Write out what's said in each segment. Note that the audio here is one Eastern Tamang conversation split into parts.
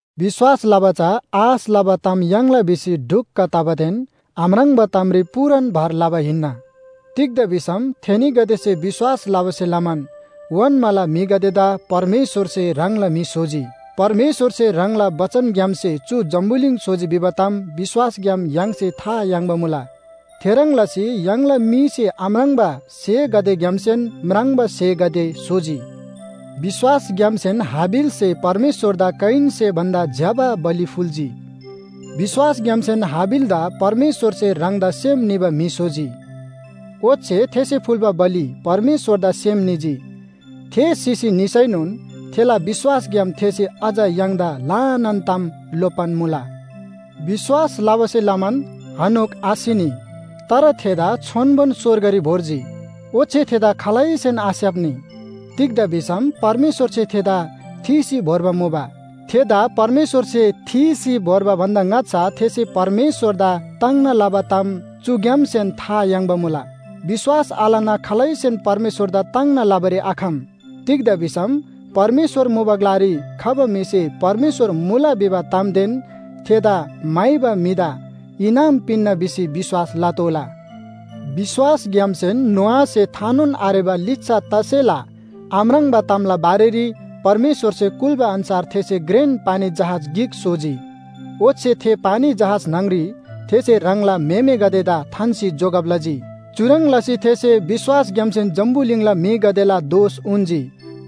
विश्‍वास लबा चा आश लबा ताम याङ्ला भिसी ढुक्‍क तबादेन आम्राङ्बा तामरी पूरान भर लबा हिन्‍ना। तिग्‍दा भिसम थेनीगदेसे विश्‍वास लबासे लमान ओन्‍माला म्‍हिगदेदा परमेश्‍वरसे ह्राङला म्‍हि स्‍होजी। परमेश्‍वरसे ह्राङला बचनग्‍यामसे चु जम्‍बुलिङ स्‍होजी भिबा ताम विश्‍वासग्‍याम य्‍हाङसे था याङ्बा मुला। थेह्रङ् लसी य्‍हाङला मीसे आम्राङ्बा स्‍हेगदेग्‍यामसेन म्राङ्बा स्‍हेगदे स्‍होजी। विश्‍वासग्‍यामसेन हाबिलसे परमेश्‍वरदा कयिनसे भन्‍दा ज्‍यबा बलि फुल्‍जी। विश्‍वासग्‍यामसेन हाबिलदा परमेश्‍वरसे ह्राङदा सेम निबा म्‍हि स्‍होजी। ओच्‍छे थेसे फुल्‍बा बलि परमेश्‍वरदा सेम निजी। थे सिसी निसैनोन थेला विश्‍वासग्‍याम थेसे अझ य्‍हाङदा ल्‍हानान ताम लोप्‍बान मुला। विश्‍वास लबासे लमान हनोक आसिनी। तर थेदा छोन्‍बोन स्‍वर्गरी भोर्जी। ओच्‍छे थेदा खालैसेन आस्‍याप्‍नी। तिग्‍दा भिसम परमेश्‍वरसे थेदा थीसी भोर्बा मुबा। थेदा परमेश्‍वरसे थीसी भोर्बा भन्‍दा ङाच्‍छा थेसे परमेश्‍वरदा ताङ्ना लबा ताम चुग्‍यामसेन था याङ्बा मुला। विश्‍वास आलना खालैसेन परमेश्‍वरदा ताङ्ना लबारी आखम। तिग्‍दा भिसम परमेश्‍वर मुबा ग्‍लारी खबा म्‍हिसे परमेश्‍वर मुला भिबा तामदेन थेदा म्‍हाइबा म्‍हिदा इनाम पिन्‍ना भिसी विश्‍वास लतोःला। विश्‍वासग्‍यामसेन नोआसे थानोन आरेबा लिच्‍छा तसेला आम्राङ्बा तामला बारेरी परमेश्‍वरसे कुल्‍बा अन्‍छार थेसे घ्रेन पानी जहाज गिक स्‍होजी। ओच्‍छे थे पानी जहाज न्‍हङरी थेसे ह्राङला म्‍हेमेगदेदा थान्‍सी जोगब लजी। चुह्रङ् लसी थेसे विश्‍वासग्‍यामसेन जम्‍बुलिङला म्‍हिगदेला दोष उन्‍जी।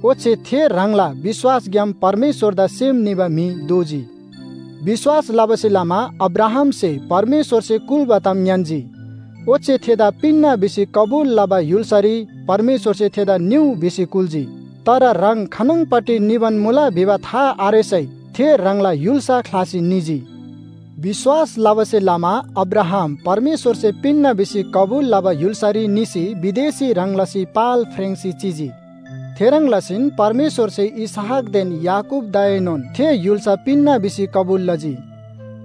ओच्‍छे थे ह्राङला विश्‍वासग्‍याम परमेश्‍वरदा सेम निबा म्‍हि दोजी। विश्‍वास लबासे लमा अब्राहामसे परमेश्‍वरसे कुल्‍बा ताम ङ्‌यान्‍जी। ओच्‍छे थेदा पिन्‍ना भिसी कबुल लबा य्‍हुल्‍सारी परमेश्‍वरसे थेदा निउ भिसी कुल्‍जी। तर ह्राङ खानङपट्टि निबान मुला भिबा था आरेसै थे ह्राङला य्‍हुल्‍सा ख्‍लासी निजी। विश्‍वास लबासे लमा अब्राहाम परमेश्‍वरसे पिन्‍ना भिसी कबुल लबा य्‍हुल्‍सारी निसी विदेशी ह्रङ् लसी पाल फ्रेङ्‌सी चिजी। थेह्रङ् लसीन परमेश्‍वरसे इसहाकदेन याकूबदाएनोन थे य्‍हुल्‍सा पिन्‍ना भिसी कबुल लजी।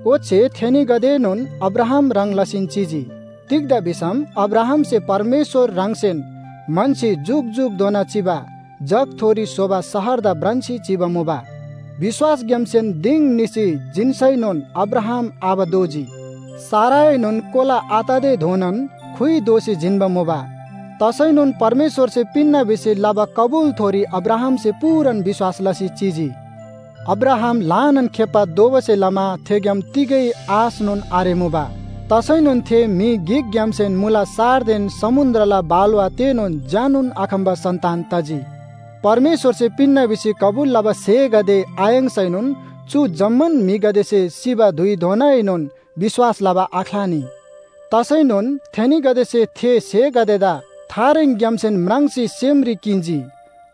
ओच्‍छे थेनीगदेएनोन अब्राहाम ह्रङ् लसीन चिजी। तिग्‍दा भिसम अब्राहामसे परमेश्‍वर ह्राङसेन म्‍हन्‍सी जुकजुकधोना चिबा जगथोरी स्‍होबा शहरदा भ्रान्‍सी चिबा मुबा। विश्‍वासग्‍यामसेन दिङ निसी जिन्‍सैनोन अब्राहाम आबा दोजी। साराएनोन कोला आत‍बाधोनान खुइ दोसी जिन्‍बा मुबा। तसैनोन परमेश्‍वरसे पिन्‍ना भिसी लबा कबुलथोरी अब्राहामसे पूरान विश्‍वास लसी चिजी। अब्राहाम ल्‍हानान खेप्‍बा दोबासे लमा थेग्‍याम तिगै आशनोन आरेमुबा। तसैनोन थे म्‍हि गिकग्‍यामसेन मुला सारदेन समुन्‍द्रला बालुवा तेनोन झ्‍यानोन आखम्‍बा सन्‍तान तजी। परमेश्‍वरसे पिन्‍ना भिसी कबुल लबा स्‍हेगदे आयाङ्‌सैनोन चु जम्‍मान म्‍हिगदेसे सिबा धुइधोनाएनोन विश्‍वास लबा आख्‍लानी। तसैनोन थेनीगदेसे थे स्‍हेगदेदा थारेङग्‍यामसेन म्राङ्सी सेमरी किन्‍जी।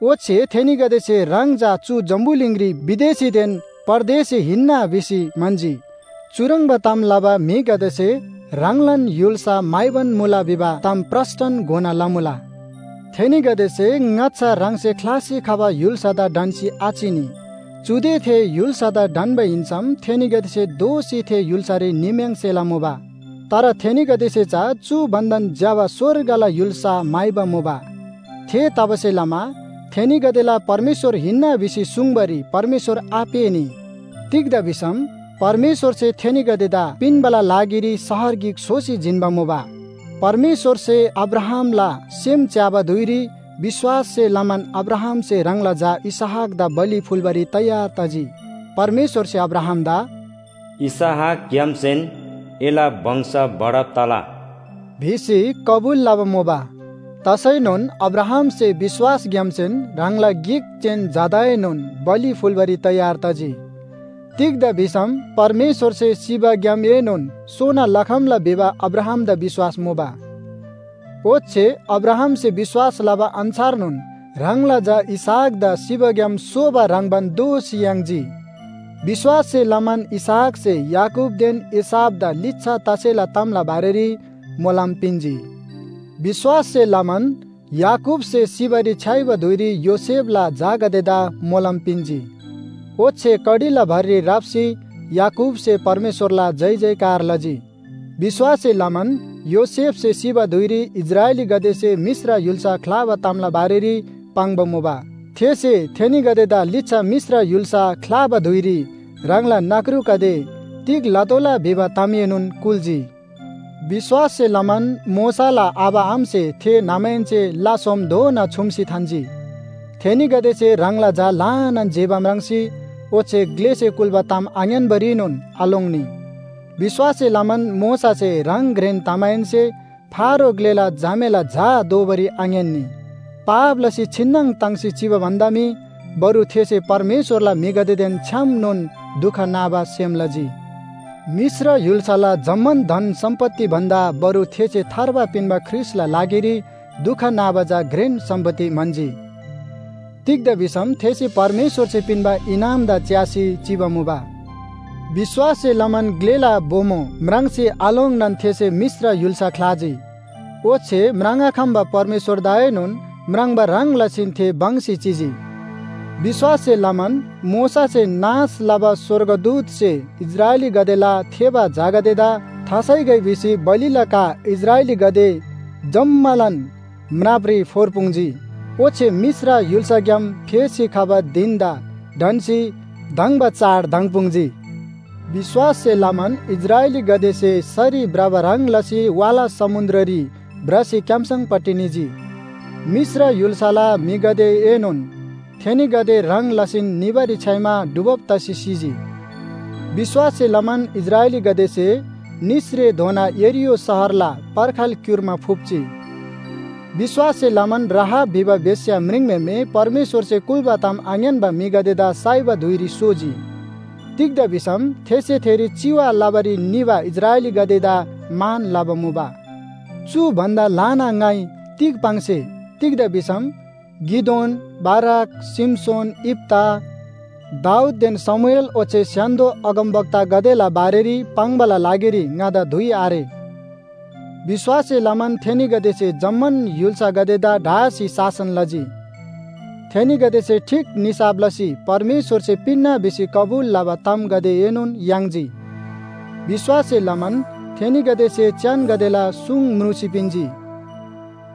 ओच्‍छे थेनीगदेसे ह्राङ चा चु जम्‍बुलिङरी विदेशीदेन परदेशी हिन्‍ना भिसी म्‍हन्‍जी। चुह्रङ्बा ताम लबा म्‍हिगदेसे ह्राङलान य्‍हुल्‍सा म्‍हाइबान मुला भिबा ताम प्रस्‍टन घोना लमुला। थेनीगदेसे ङाच्‍छा ह्राङसे ख्‍लासी खबा य्‍हुल्‍सादा ढन्‍सी आचिनी। चुदे थे य्‍हुल्‍सादा ढन्‍बा हिन्‍सम थेनीगदे दोःसी थे य्‍हुल्‍सारी निम्‍याङ्सेला मुबा। तर थेनीगदेसे चा चु भन्‍दान ज्‍यबा स्‍वर्गला य्‍हुल्‍सा म्‍हाइबा मुबा। थेतबासेलमा थेनीगदेला परमेश्‍वर हिन्‍ना भिसी सुङ्बारी परमेश्‍वर आपेःनी। तिग्‍दा भिसम परमेश्‍वरसे थेनीगदेदा पिन्‍बाला लागिरी शहर गिक स्‍होसी जिन्‍बा मुबा। परमेश्‍वरसे अब्राहामला सेम च्‍याबा धुइरी विश्‍वाससे लमान अब्राहामसे ह्राङला झा इसहाकदा बलि फुल्‍बारी तयार तजी। परमेश्‍वरसे अब्राहामदा “इसहाकग्‍यामसेन एला वंश बढब तला” भिसी कबुल लबा मुबा। तसैनोन अब्राहामसे विश्‍वासग्‍यामसेन ह्राङला गिक जेन झादाएनोन बलि फुल्‍बारी तयार तजी। तिग्‍दा भिसम परमेश्‍वरसे सिबाग्‍यामएनोन सोना लखम्‍ला भिबा अब्राहामदा विश्‍वास मुबा। ओच्‍छे अब्राहामसे विश्‍वास लबा अन्‍छारनोन ह्राङला झा इसहाकदा सिबाग्‍याम सोबा ह्रङ्‌बान दोःसी याङ्जी। विश्‍वाससे लमान इसहाकसे याकूबदेन एसावदा लिच्‍छा तसेला तामला बारेरी मोलम पिन्‍जी। विश्‍वाससे लमान याकूबसे सिबारी छ्‌याइबा धुइरी योसेफला झागदेदा मोलम पिन्‍जी। ओच्‍छे कडीला भररी राप्‍सी याकूबसे परमेश्‍वरला जयजयकार लजी। विश्‍वाससे लमान योसेफसे सिबा धुइरी इस्राएलीगदेसे मिश्र य्‍हुल्‍सा ख्‍लाबा तामला बारेरी पाङ्बा मुबा। थेसे थेनीगदेदा लिच्‍छा मिश्र य्‍हुल्‍सा ख्‍लाबा धुइरी ह्राङला नख्रुगदे तिग लतोःला भिबा तामएनोन कुल्‍जी। विश्‍वाससे लमान मोशाला आबा आमासे थे न्‍हमाहेन्‍से ला सोमधोना छुम्‍सी थान्‍जी। थेनीगदेसे ह्राङला झा ल्‍हानान जेबा म्राङ्जी, ओच्‍छे ग्‍लेसे कुल्‍बा ताम आङ्‌यान्‍बारीनोन आलोङ्नी। विश्‍वाससे लमान मोशासे ह्राङ घ्रेन तमाहेन्‍से फारो ग्‍लेला झामेला झा दोबारी आङ्‌यान्‍नी। पाप लसी छिन्‍नङ ताङ्सी चिबा भन्‍दा मी बरु थेसे परमेश्‍वरला म्‍हिगदेदेन छ्‌यामनोन दुख नाबा सेम लजी। मिश्र य्‍हुल्‍साला जम्‍मान धन सम्‍पत्ति भन्‍दा बरु थेसे थार्बा पिन्‍बा ख्रीष्‍टला लागिरी दुख नाबा चा घ्रेन सम्‍पत्ति म्‍हन्‍जी। तिग्‍दा भिसम थेसे परमेश्‍वरसे पिन्‍बा इनामदा च्‍यासी चिबा मुबा। विश्‍वाससे लमान ग्‍लेला बोमो म्राङ्सी आलोङ्नान थेसे मिश्र य्‍हुल्‍सा ख्‍लाजी। ओच्‍छे म्राङ्आखम्‍बा परमेश्‍वरदाएनोन म्राङ्बा ह्रङ् लसीन थे भङ्‍सी चिजी। विश्‍वाससे लमान मोशासे नाश लबा स्‍वर्गदूतसे इस्राएलीगदेला थेबा झागदेदा थासाइगै भिसी बलिला का इस्राएलीगदे जम्‍मालान म्रापरी फोर्पुङ्‌जी। ओच्‍छे मिश्र य्‍हुल्‍साग्‍याम फेसी खबा धिन‍दा ढन्‍सी धङ्बा चाड धङ्‍पुङ्‌जी। विश्‍वाससे लमान इस्राएलीगदेसे सरी भ्रबा ह्रङ् लसी वाला समुन्‍द्ररी भ्रसी क्‍याम्‍सङपट्टि निजी। मिश्र य्‍हुल्‍साला म्‍हिगदेएनोन थेनीगदे ह्रङ् लसीन निबारी छ्‌याइमा डुबब तसी सिजी। विश्‍वाससे लमान इस्राएलीगदेसे निसरेधोना यरीहो शहरला पर्खाल क्‍युर्मा फुप्‍जी। विश्‍वाससे लमान राहाब भिबा बेश्‍या म्रिङम्‍हेमे परमेश्‍वरसे कुल्‍बा ताम आङ्‌यान्‍बा म्‍हिगदेदा साइबा धुइरी सोजी। तिग्‍दा भिसम थेसे थेरी चिवा लबारी निबा इस्राएलीगदेदा मान लबा मुबा। चु भन्‍दा ल्‍हाना ङाइ तिग पाङ्से? तिग्‍दा भिसम गिदोन, बाराक, शिमशोन, यिप्‍ता, दाऊददेन शमूएल ओच्‍छे स्‍य्‍हान्‍दो अगमवक्तागदेला बारेरी पाङ्‌बाला लागिरी ङादा धुइ आरे। विश्‍वाससे लमान थेनीगदेसे जम्‍मान य्‍हुल्‍सागदेदा ढासी शासन लजी। थेनीगदेसे ठीक निसाफ लसी परमेश्‍वरसे पिन्‍ना भिसी कबुल लबा तामगदेएनोन याङ्जी। विश्‍वाससे लमान थेनीगदेसे च्‍यानगदेला सुङ म्रुसी पिन्‍जी।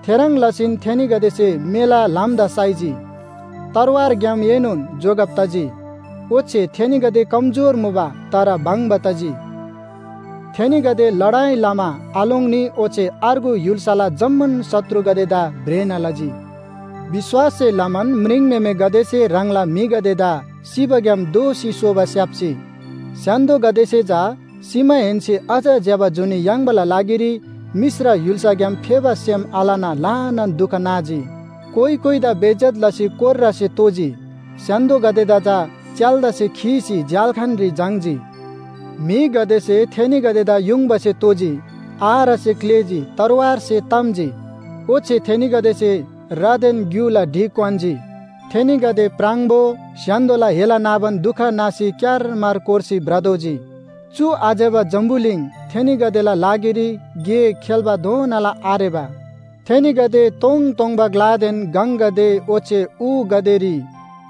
थेह्रङ् लसीन थेनीगदेसे मेला ल्‍हामदा साइजी, तरवारग्‍यामएनोन जोगब तजी। ओच्‍छे थेनीगदे कमजोर मुबा, तर भङ्‍बा तजी। थेनीगदे लडाइ लमा आलोङ्नी ओच्‍छे अर्गु य्‍हुल्‍साला जम्‍मान शत्रुगदेदा भ्रेना लजी। विश्‍वाससे लमान म्रिङम्‍हेमेगदेसे ह्राङला म्‍हिगदेदा सिबाग्‍याम दोःसी सोबा स्‍याप्‍जी। स्‍य्‍हान्‍दोगदेसे चा सिमाहेन्‍से अझ ज्‍यबा जुनी याङ्बाला लागिरी मिश्र य्‍हुल्‍साग्‍याम फेबा सेम आलना ल्‍हानान दुख नाजी। कोइ कोइदा बेइज्‍जत लसी कोर्रासे तोजी, स्‍य्‍हान्‍दोगदेदा चा च्‍याल्‍दासे खीसी झ्‍याल्‍खानरी झाङ्‌जी। म्‍हिगदेसे थेनीगदेदा युङबासे तोजी, आरासे क्‍लेजी, तरवारसे ताम्‍जी। ओच्‍छे थेनीगदेसे रादेन ग्‍युला ढि क्‍वान्‍जी। थेनीगदे प्राङबो, स्‍य्‍हान्‍दोला हेला नाबान दुख नासी क्‍यारमार कोर्सी भ्रतोःजी। चु आज्‍यबा जम्‍बुलिङ थेनीगदेला लागिरी गे खेल्‍बाधोनाला आरेबा। थेनीगदे तोङतोङबा ग्‍लादेन गङगदे ओच्‍छे ऊगदेरी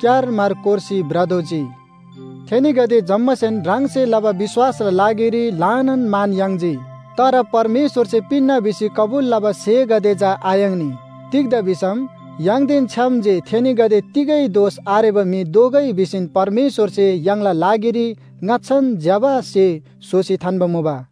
क्‍यारमार कोर्सी भ्रतोःजी। थेनीगदे जम्‍मासेन ह्राङसे लबा विश्‍वासला लागिरी ल्‍हानान मान याङ्जी। तर परमेश्‍वरसे पिन्‍ना भिसी कबुल लबा स्‍हेगदे चा आयाङ्नी। तिग्‍दा भिसम य्‍हाङदेन छ्‌याम जे थेनीगदे तिगै दोष आरेबा म्‍हि दोगै भिसीन परमेश्‍वरसे य्‍हाङला लागिरी ङाच्‍छान ज्‍यबा स्‍हे स्‍होसी थान्‍बा मुबा।